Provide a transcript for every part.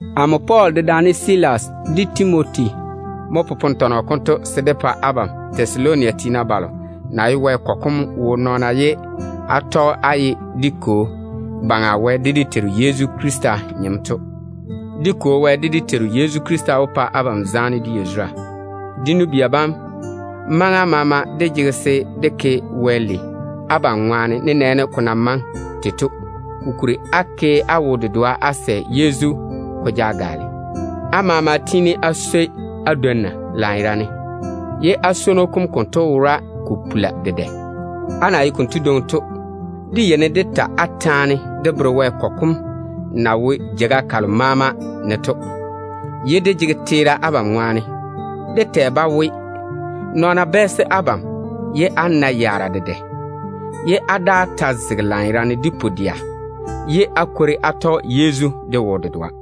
Amo Pɔɔl, dedaane Silas de Timoti mo popone tɔnɔ konto se dé pa abam Tɛsaloni tiina balo na ye Wɛ kɔgɔ kom wo nɔɔna ye á tɔge á ye dé Kwo Baŋa Wɛ de dé Teiru Yezu Krista nyem to. Dé Kwo Wɛ, de dé Teiru Yezu Krista wó pa abam zaane de yazura. Dé nu-bia bam, maŋa maama dé jege se dé ke Wɛ lei abam ŋwaane nenɛɛne ko na maŋe tei to, kokuri á na ke á wo-dedoa de Yezu tei to ke ko daŋe da-baŋa ne. Á maama tiini á swoi á dwonna lanyerane, ye á swono kom konto wora ko pula dedɛ. Á na ye konto dwoŋi to, dé yeini dé ta á taane dé bere Wɛ kɔgɔ kom na wo jeiga kalo maama ne to, ye dé jege teera abam ŋwaane. Dé tɛ-ba we, nɔɔna yeini ba bɛɛse abam ye á nae yaara dedɛ. Á nam ta zege lanyerane de pu-dɛa, ye á yɔɔre á tɔge Yezu de wo-dedoa.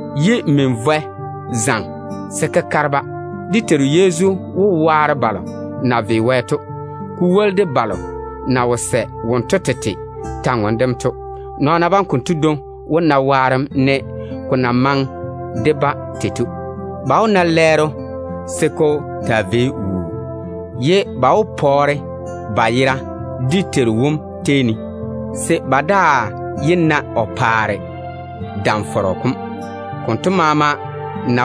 ye min-vɔɛ zaŋe se kekare-ba. O maa wó waare balo na ve Wɛ to, ko woli de balo na wo sɛ omo kwor-ywoŋa kam to. Nɔɔna bam konto dwoŋi wó na waarem, ne ko na maŋe de-ba tei to mo. Ba maa wó na lɛɛro se ko taa vei wuu. Ba ta maa wó pɔɔre ba yera dé Teiru wom tei ne, se ba daa yé na o paare dam-fɔrɔ kom. Konto maama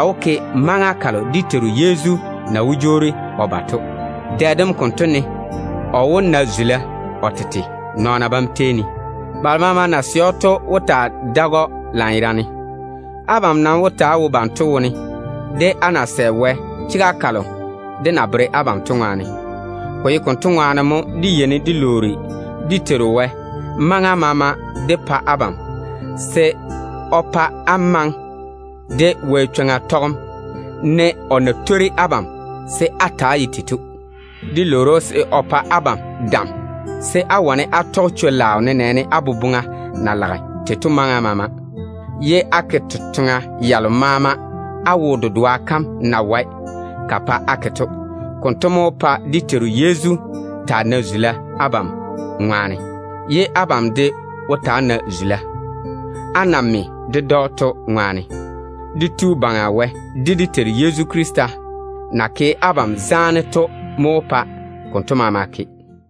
wó ke maŋa kalo dé Teiru Yezu na wó jwoori o ba to. Dɛ dem konto ne o wó na zula o tete nɔɔna bam tei ne. Balo maama na sɛ‑o to wó taa seini‑o lanyerane. Abam nam wó ta‑á wo banto wone, á na sɛ Wɛ chega kalo dé na bere abam to ŋwaane. Ko ye konto ŋwaane mo dé yeini dé lwoori dé Tu Wɛ wom maŋa maama dé pa abam, se o pa á maŋe de Wɛ chwoŋa tɔgem ne o na twori abam se á ta‑á ye tei to. Dé lwoori‑o se o pa abam dam, se á wane á tɔge chwo-laao nenɛɛne á boboŋa na lage tei to maama, ye á ke totoŋa yalo maama á wo-dedoa kam na wae ka pa á ke to. Konto mo wó pa dé Teiru Yezu taa nae zula abam ŋwaane. Abam de maa wó na zula, á na me ded‑o to ŋwaane. Dé Tu Baŋa Wɛ, de dé Teiru Yezu Krista na ke abam zaane to mo wó pa konto maama ke.